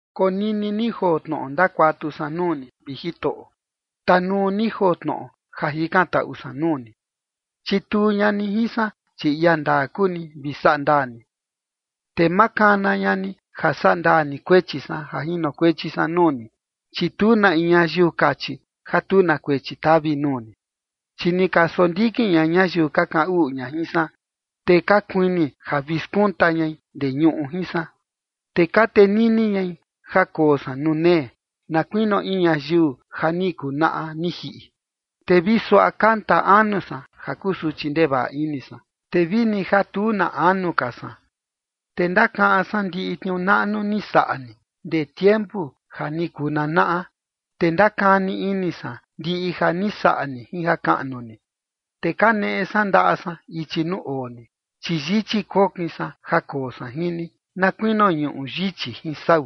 Konini ni joo tnoꞌo ndakuatu san nuu ni, vi Jitoꞌo. Tanuu ni joo tnoꞌo ja jikantaꞌu san nuu ni. Chituu ña ni jin san, chi ia ndaa kuu ni, vi saꞌa ndaa ni. Te ma kana ña ni ja sandaa ni kuechi san ja jinokuechi san nuu ni, chi tu na in ñayiu kachi ja tu na kuechi tavi nuu ni. Chi ni ka sondikin ña ñayiu ka kaꞌan uꞌu ña jin san, te ka kuini ja vi skunta ñai ndee ñuꞌu jin san. Te ka tenini ñai ja koo san nuu nee, na kuinio in ñayiu ja ni kuu naꞌa ni jiꞌi. Te vi suaꞌa kanta anu san ja kusuchi ndevaꞌa ini san, te vini ja tu na anu ka san. Te ndakaꞌan san ndiꞌi tniuu naꞌnu ni saꞌa ni, ndee tiempu ja ni kuu nanaꞌa, te ndakani ini san ndiꞌi ja ni saꞌa ni jin jakaꞌnu ni. Te kaneꞌe san ndaꞌa san ichi nuu oo ni, chi yichi kokin san ja koo san jin ni, na kuinio ñuꞌu yichi jin sau.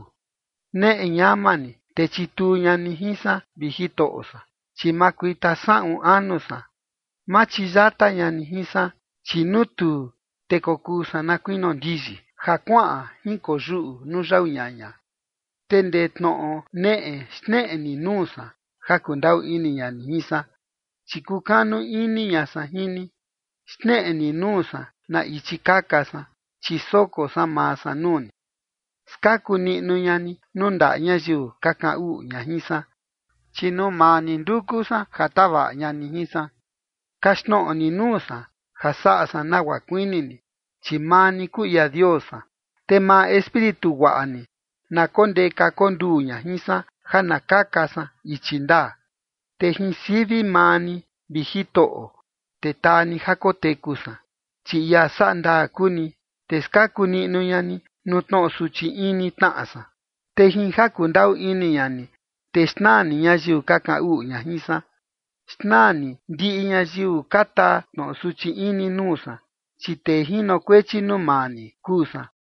Neꞌe ñama ni, te chituu ña ni jin san, vi Jitoꞌo san, chi makuita saꞌun anu san. Ma chiyata ña ni jin san, chi nuu tuu, te kokuu san na kuinio ndiyi, ja kuaꞌan jinkoyuꞌu nuu yau ñaña. Te ndee tnoꞌo neꞌe xneꞌe ni nuu san, ja kundaꞌu ini ña ni jin san, chi kukanu ini ña san jin ni. Xneꞌe ni nuu san na ichi kaka san, chi soko san maa san nuu ni. Skaku niꞌnu ña ni nuu ndaꞌa ñayiu ka kaꞌan uꞌu ña jin san, chi nuu maa ni nduku san ja tavaꞌa ña ni jin san. Kaxtnoꞌo ni nuu san ja saꞌa san nagua kuini ni, chi maa ni kuu ia Dios san. Te maa espíritu guaꞌa ni, na kondeka konduu ña jin san ja na kaka san ichi ndaa. Te jin sivi maa ni, vi Jitoꞌo, te taa ni ja koteku san, chi ia saꞌa ndaa kuu ni, te skaku niꞌnu ña ni nuu tnoꞌo suchi ini tnaꞌa san. Te jin ja kundaꞌu ini ña ni, te xnaa ni ñayiu ka kaꞌan uꞌu ña jin san. Xnaa ni ndiꞌi ñayiu ka taa tnoꞌo suchi ini nuu san, chi tee jinokuechi nuu maa ni kuu san.